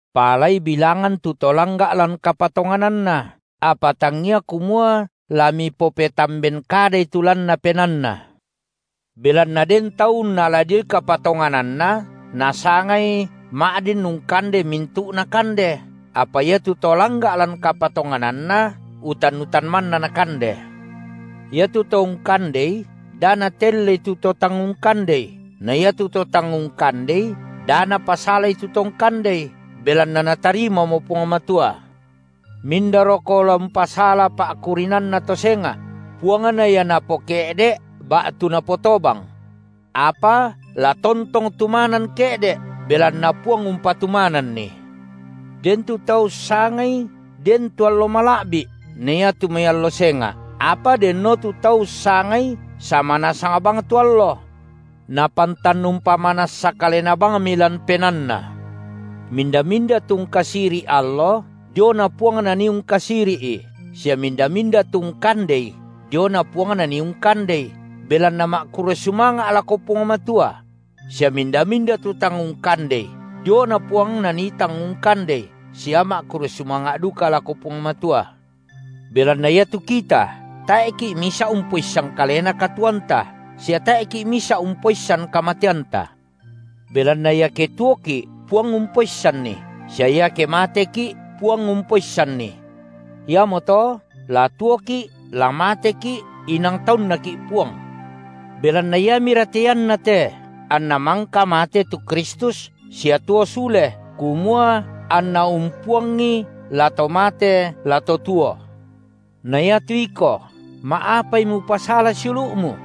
Paalai bilangan tu to langga’ lan kapatongananna, apa tangia kumua la mipopetamben kadai tu lanna penaanna. Belanna den tau unnala dioi kapatongananna nasangai ma’din ungkande mintu’na kande, apa iatu to langga’ lan kapatongananna utan-utan manna nakande. Iatu to ungkandei da natellei tu to tang ungkandei na iatu to tang ungkandei da napasalai tu to ungkandei, belanna Natarimamo Puang Matua. Mindaroko la umpasala pa’kurinanna to senga’? Puangna ia napoke’de’ ba’tu napotobang. Apa la tontong tumanan ke’de’, belanna Puang umpatumananni. Den tu tau ussangai den tu allo mala’bi’ na iatu mai allo senga’, apa denno tu tau ussangai sama nasang bang tu allo. Napantan umpamanassa kalena bangmi lan penaanna. Minda-minda tu ungkasiri’ allo, diona Puang nanii ungkasiri’i, sia minda-minda tu ungkandei, diona Puang nanii ungkandei, belanna ma’kurre sumanga’ lako Puang Matua; sia minda-minda tu tang ungkandei, diona Puang nanii tang ungkandei sia ma’kurre sumanga’ duka lako Puang Matua. Belanna iatu kita, tae’ki’ misa’ umpoissan kalena katuoanta, sia tae’ki’ misa’ umpoissan kamateanta. Belanna iake tuoki’, Puang umpoissanni, sia iake mateki’ Puang umpoissanni. Iamoto la tuoki’ la mateki’ inang taunNaki’ Puang. Belanna iamira te ianna te anNa mangka mate tu Kristus sia tuo sule, kumua anNa umpuangi la to mate la tu tuo. Na iatu iko, ma’apai mupasala siulu’mu?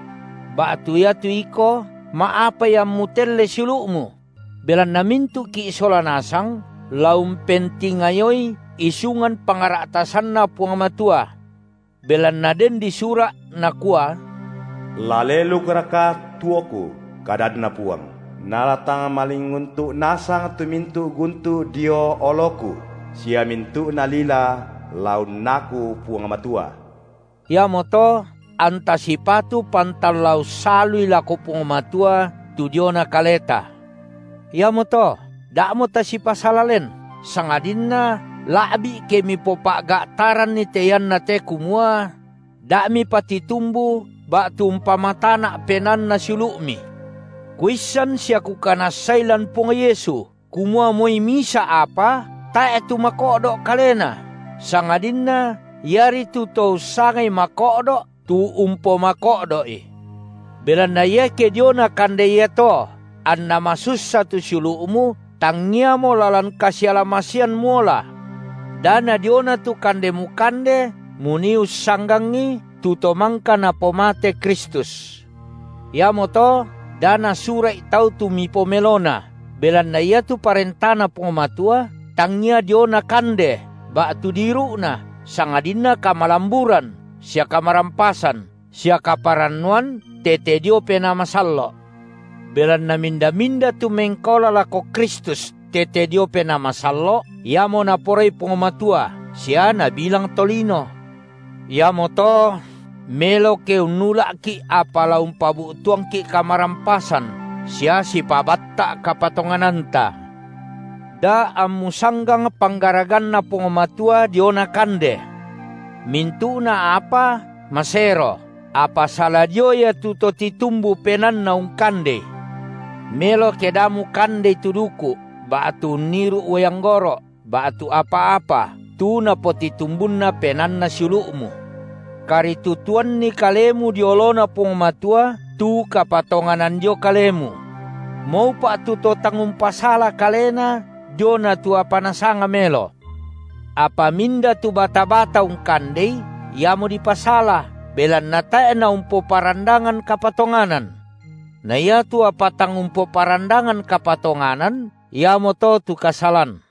Ba’tu iatu iko, ma’apai ammu telle siulu’mu? Belanna mintu’ki’ sola nasang la umpentingayoi isungan pangra’tasanNa Puang Matua. Belanna den disura’, nakua: La lelukraka tuoKu, kadanNa Puang, nala tang malinguntu’ nasang tu mintu’ guntu’ dio oloKu, sia mintu’na lila la unnaku Puang Matua. Iamoto anta sipatu pantan la ussalui (lako Puang Matua) tu diona kaleta. Iamoto, da’mo tasipasala len, sangadinna la’bi’ ke mipopa’ga’taranni te ianna te kumua: da’ mipatitumbu ba’tu umpamatana’ penaanna siulu’mi. Kuissan sia kukanassai, lan Puang Yesu, kumua moi misa’ apa tae’ tu mako’do’ kalena, sangadinna iari tu to ussangai mako’do’ tu umpomako’do’i. Belanna iake diona kande iato anna masussa tu siulu’mu, tangiamo lalan kasiala-masean muola. Da nadiona tu kande mukande munii ussanggangi, tu to mangka Napomate Kristus. Iamoto da nasura’i tau tu mipomelona, belanna iatu ParentaNa Puang Matua tangia diona kande ba’tu diiru’na, sangadinna kamalamburan sia kamarampasan sia kaparannuan tete dio Penaa Masallo’. Belanna minda-minda tu mengkaola lako Kristus tete dio Penaa Masallo’, iamo Naporai Puang Matua sia nabilang tolino. Iamoto melo ke unnula’ki’ apa la umpabu’tuangki’ kamarampasan sia sipabatta’ kapatongananta. Da ammu sanggang panggaraganNa Puang Matua diona kande. Mintu’na apa masero, apa sala dio ia tu to titumbu penaanna ungkandei. Melo ke da mukandei tu duku’, ba’tu unniru’ uai anggoro’, ba’tu apa-apa, tu napotitumbunna penaanna siulu’mu. Karitutuanni kalemu dio oloNa Puang Matua tu kapatonganan dio kalemu. Maupa’ tu to tang umpasala kalena diona tu apa nasanga melo. Apa minda tu bata-bata ungkandei, iamo dipasala, belanna tae’ naumpoparandangan kapatonganan. Na iatu apa tang umpoparandangan kapatonganan, iamoto tu kasalan.